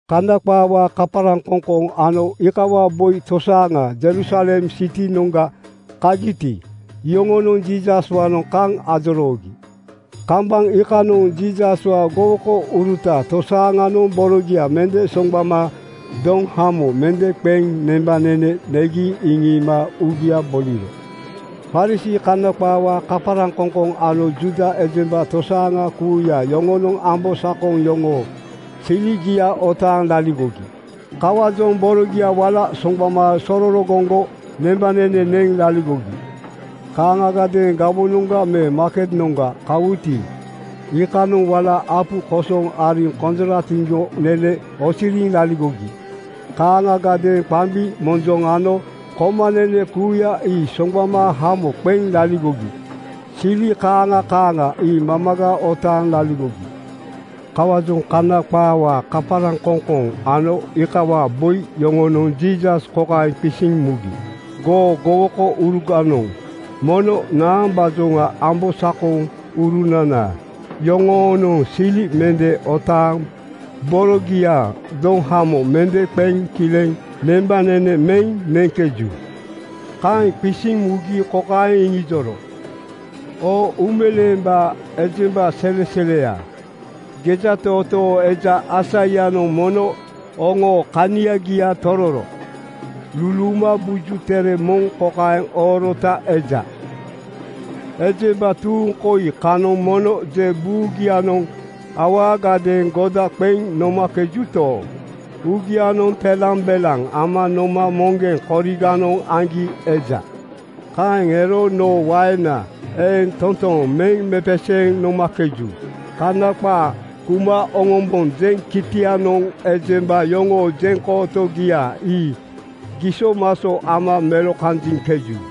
Kana qaawaa kaparaŋkoŋkoŋ ano iikawaa boi tosaaŋa Jerusalem sitinoŋga kagiti, iyoŋonoŋ Jiisaswaanoŋ kaŋ ajoroogi. Kambaŋ iikanoŋ Jiisaswaa gowokouruta tosaaŋanoŋ borogia mende soŋgbama doŋhamo mende qeŋ nembanene negi iŋiima uugia boliro. Farisii (Kana qaawaa kaparaŋkoŋkoŋ) ano Juuda ejemba tosaaŋa kuuya yoŋonoŋ ambosakoŋ yoŋoo siligia otaaŋ laligogi. Kawaajoŋ borogia wala soŋgbama sororogoŋgo nembanene neŋ laligogi. Kaaŋagadeeŋ gawonoŋga me maaketnoŋga kawuti, iikanoŋ wala apu kosoŋ ariŋ konjoratiŋgo nene oosiriŋ laligogi. Kaaŋagadeeŋ qambi, monjoŋ ano komanene kuuya ii soŋgbama hamo qeŋ laligogi. Sili kaaŋa kaaŋa ii mamaga otaaŋ laligogi. Kawaajoŋ Kana qaawaa kaparaŋkoŋkoŋ ano iikawaa boi yoŋonoŋ Jiisas kokaeŋ qisiŋ mugi, “Goo gowokouruganoŋ mono naambaajoŋa ambosakoŋurunana yoŋoonoŋ sili mende otaaŋ borogia doŋhamo mende qeŋ kileŋ nembanene meŋ neŋkeju.” Kaeŋ qisiŋ mugi kokaeŋ iŋijoro, “Oo uumeleembaa ejemba seleseleya, gejatootoo eja Aisaianoŋ mono oŋoo kaniagia tororo luluuma Buju Tere moŋ kokaeŋ oorota eja, ‘Ejemba tuuŋ koi kanoŋ mono je buugianoŋ awaagadeeŋ goda qeŋ nomakejuto, uugianoŋ telambelaŋ ama noma moŋgeŋ koriganoŋ aŋgi eja. Kaeŋ ero noo waena eeŋ toontooŋ meŋ mepeseeŋ nomakeju. Kana qaa kuma oŋombonjeŋ kitianoŋ ejemba yoŋoo jeŋkootogia ii gisomaso ama melokanjiŋkeju.’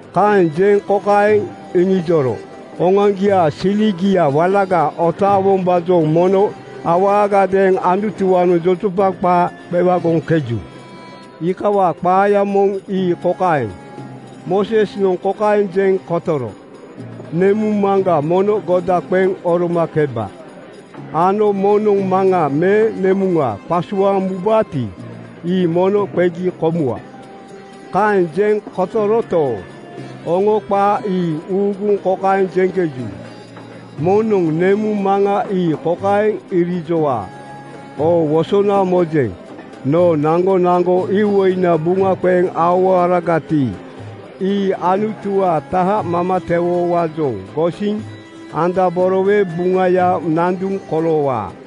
Kaeŋ jeŋ kokaeŋ iŋijoro, “Oŋoaŋgiaa siligia walaga otaawombaajoŋ mono awaagadeeŋ Anutuwaanoŋ jojopaŋ qaa qewagoŋkeju. Iikawaa qaaya moŋ ii kokaeŋ: Moosesnoŋ kokaeŋ jeŋ kotoro, ‘Nemuŋ maŋga mono goda qeŋ oromakeba,’ ano ‘Moŋnoŋ maŋa me nemuŋa qasuaaŋ mubaati, ii mono qegi komuwa.’ Kaeŋ jeŋ kotoroto, oŋo qaa ii uuguŋ kokaeŋ jeŋkeju, ‘Moŋnoŋ nemuŋ maŋa ii kokaeŋ irijowaa: Oo wosona mojeŋ. Noo naŋgonaŋgo iwoina buŋa qeŋ aowaoragati, ii Anutuwaa taha mamatewowaajoŋ gosiŋ andaborowe buŋayaa nanduŋa koloowaa.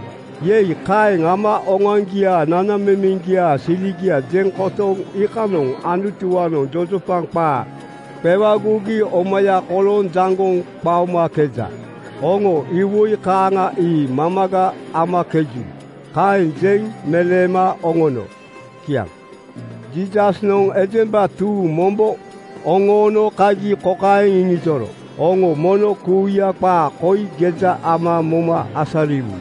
Yei! Kaeŋ ama oŋoaŋgiaa nanamemeŋgiaa siligia jeŋ kotoŋ iikanoŋ Anutuwaanoŋ jojopaŋ qaa qewagogi omaya kolooŋ jaŋgoŋ qaomakeja. Oŋo iwoi kaaŋa ii mamaga amakeju.” Kaeŋ jeŋ meleema oŋono. Kiaŋ. Jiisasnoŋ ejemba tuuŋ mombo oŋoono kagi kokaeŋ iŋijoro, “Oŋo mono kuuya qaa koi geja ama moma asariwu.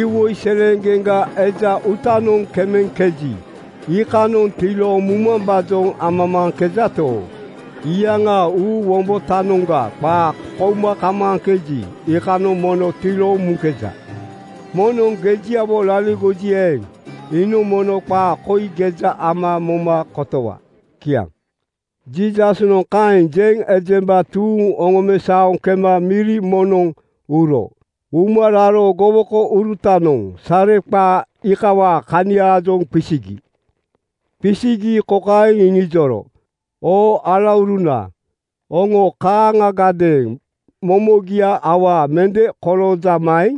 Iwoi seleeŋgeŋga eja uutanoŋ kemeŋkeji, iikanoŋ tilooŋ mumambaajoŋ amamaaŋkejato, iyaŋaa uu wombotanoŋga qaa kouma kamaaŋkeji, iikanoŋ mono tilooŋ muŋkeja. Moŋnoŋ gejiawo laligoji eeŋ, iinoŋ mono qaa koi geja ama moma kotowa.” Kiaŋ. Jiisasnoŋ kaeŋ jeŋ ejemba tuuŋ oŋomesaoŋ kema miri moŋnoŋ uro. Uma raro gowokourutanoŋ sareqaa iikawaa kaniaajoŋ qisigi. Qisigi kokaeŋ iŋijoro, “Oo alauruna, oŋo kaaŋagadeeŋ momogia awaa mende koloojamaeŋ?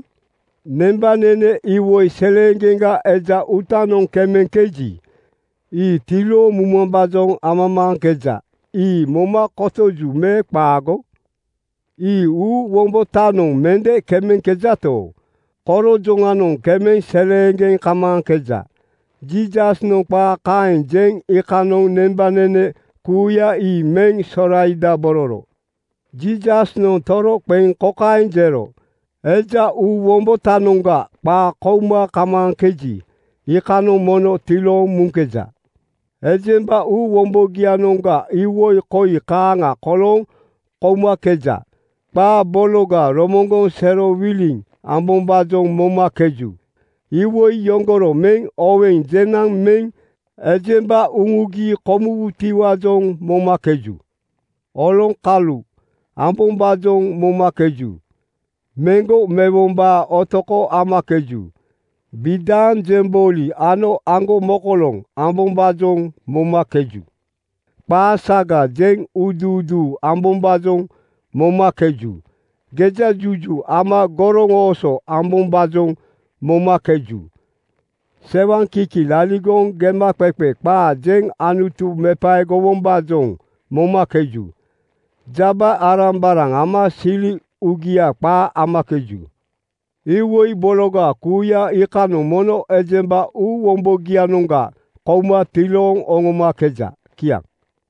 Nembanene iwoi seleeŋgeŋga eja uutanoŋ kemeŋkeji, ii tilooŋ mumambaajoŋ amamaaŋkeja. Ii moma kotoju me qaago? Ii uu wombotanoŋ mende kemeŋkejato, korojoŋanoŋ kemeŋ seleeŋgeŋ kamaaŋkeja.” Jiisasnoŋ qaa kaeŋ jeŋ iikanoŋ nembanene kuuya ii meŋ soraidabororo. Jiisasnoŋ toroqeŋ kokaeŋ jero, “Eja uu wombotanoŋga qaa kouma kamaaŋkeji, iikanoŋ mono tilooŋ muŋkeja. Ejemba uu wombogianoŋga iwoi koi kaaŋa kolooŋ koumakeja: Qaa bologa romoŋgoŋ serowiliŋ ambombaajoŋ momakeju. Iwoi yoŋgoro meŋ oweŋ jenaŋ meŋ ejemba uŋugi komuwutiwaajoŋ momakeju. Oloŋkalu ambombaajoŋ momakeju. Meŋgo mewombaa otoko amakeju. Bidaaŋ jembooli ano aŋgomokoloŋ ambombaajoŋ momakeju. Qaa saga jeŋ uuduuduu ambombaajoŋ momakeju. Gejajuju ama goroŋooso ambombaajoŋ momakeju. Sewaŋkiki laligoŋ gemaqeqe qaa jeŋ Anutu mepaegowombaajoŋ momakeju. Jaba-arambaraŋ ama sili uugia qaa amakeju. Iwoi bologa kuuya iikanoŋ mono ejemba uu wombogianoŋga kouma tilooŋ oŋomakeja.” Kiaŋ.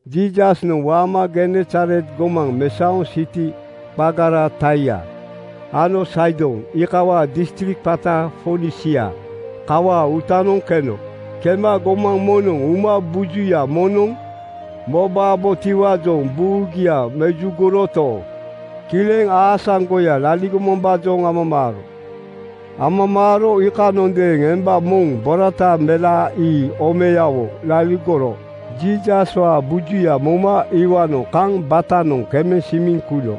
Jiisasnoŋ waama Genesaret gomaŋ mesaoŋ siti qagara Taia ano Saidon iikawaa distrik qata Fonisia kawaa uutanoŋ keno. Kema gomaŋ moŋnoŋ uma bujuya moŋnoŋ mobabotiwaajoŋ buugia mejugoroto, kileŋ aasaŋgoya laligomambaajoŋ amamaaro. Amamaaro iikanondeeŋ emba moŋ borata melaa ii omeyawo laligoro Jiisaswaa bujuya moma iwaanoŋ kaŋ batanoŋ kemeŋ simiŋ kuno.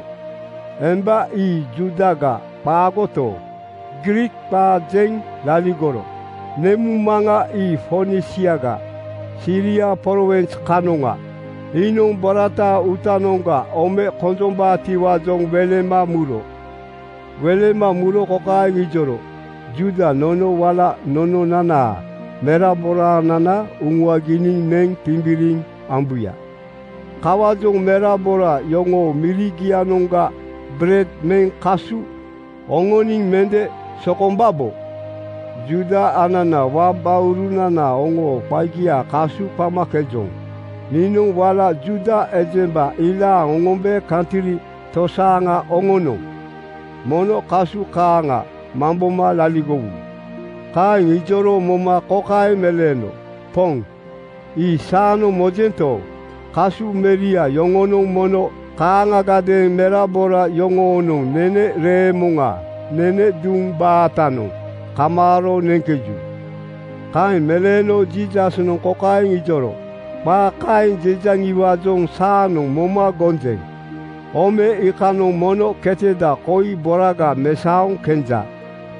Emba ii Juudaga qaagoto, Griik qaa jeŋ laligoro. Nemuŋ maŋa ii Fonisiaga Siria prowins kanoŋa. Iinoŋ borataa uutanoŋga ome konjombaatiwaajoŋ welema muro. Welema muro kokaeŋ ijoro, “Juuda nono wala nononanaa meraboraanana uŋuaginiŋ neŋ timbiriŋ ambuya. Kawaajoŋ merabora yoŋoo mirigianoŋga bered meŋ kasu oŋoniŋ mende sokombabo. Juuda anana wabaurunana oŋoo qagia kasu qamakejoŋ. Niinoŋ wala Juuda ejemba ilaaŋ oŋombe kantri tosaaŋa oŋonoŋ mono kasu kaaŋa mamboma laligowu.” Kaeŋ ijoro moma kokaeŋ meleeno, “Poŋ, ii saanoŋ mojento, kasu meria yoŋonoŋ mono kaaŋagadeeŋ merabora yoŋoonoŋ nene reemoŋa nene duŋ baatanoŋ kamaaro neŋkeju.” Kaeŋ meleeno Jiisasnoŋ kokaeŋ ijoro, “Qaa kaeŋ jejaŋiwaajoŋ saanoŋ moma gonjeŋ. Ome iikanoŋ mono keteda koi boraga mesaoŋ kenja.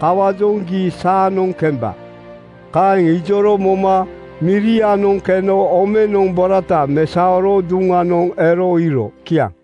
Kawaajoŋ gii saanoŋ kemba.” Kaeŋ ijoro moma mirianoŋ keno omenoŋ borata mesaoro duŋanoŋ ero iiro. Kiaŋ.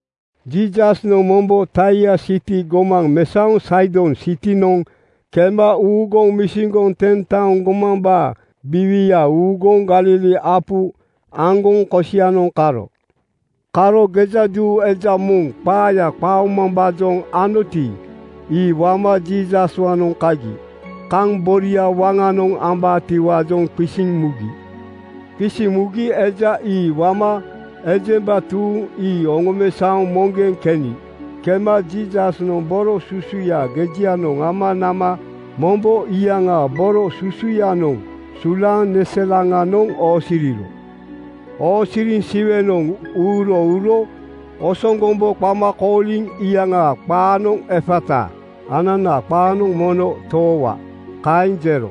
Jiisasnoŋ mombo Taia siti gomaŋ mesaoŋ Saidon sitinoŋ kema uuguŋ misiŋgoŋ Ten-taoŋ gomambaa biiwia uuguŋ Galili apu aŋgoŋ kosianoŋ karo. Karo gejaduu eja moŋ qaaya qaomambaajoŋ anoti, ii wama Jiisaswaanoŋ kagi. Kaŋ boria waŋanoŋ ambaatiwaajoŋ qisiŋ mugi. Qisiŋ mugi eja ii wama ejemba tuuŋ ii oŋomesaoŋ moŋgeŋ keni. Kema Jiisasnoŋ boro susuya gejianoŋ ama nama mombo iyaŋaa boro susuyanoŋ sulaaŋ neselaŋanoŋ oosiriro. Oosiriŋ Siwenoŋ uuro uro osoŋgombo qama kooliŋ iyaŋaa qaanoŋ “Efata,” ananaa qaanoŋ ‘Mono toowa,’ kaeŋ jero.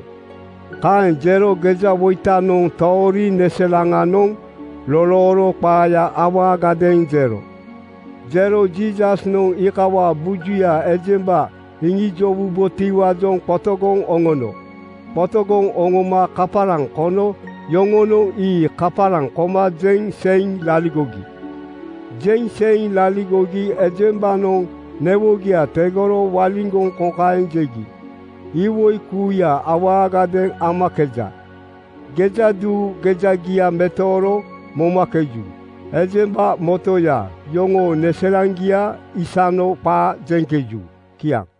Kaeŋ jero gejawoitanoŋ toori neselaŋanoŋ lolooro qaaya awaagadeeŋ jero. Jero Jiisasnoŋ iikawaa bujuya ejemba iŋijowubotiwaajoŋ qotogoŋ oŋono. Qotogoŋ oŋoma kaparaŋ kono yoŋonoŋ ii kaparaŋ koma jeŋ seiŋ laligogi. Jeŋ seiŋ laligogi ejembanoŋ newogia tegoro waliŋgoŋ kokaeŋ jegi, “Iwoi kuuya awaagadeeŋ amakeja. Gejaduu gejagia metooro momakeju. Ejemba motoya yoŋoo neselaŋgia isano qaa jeŋkeju.” Kiaŋ.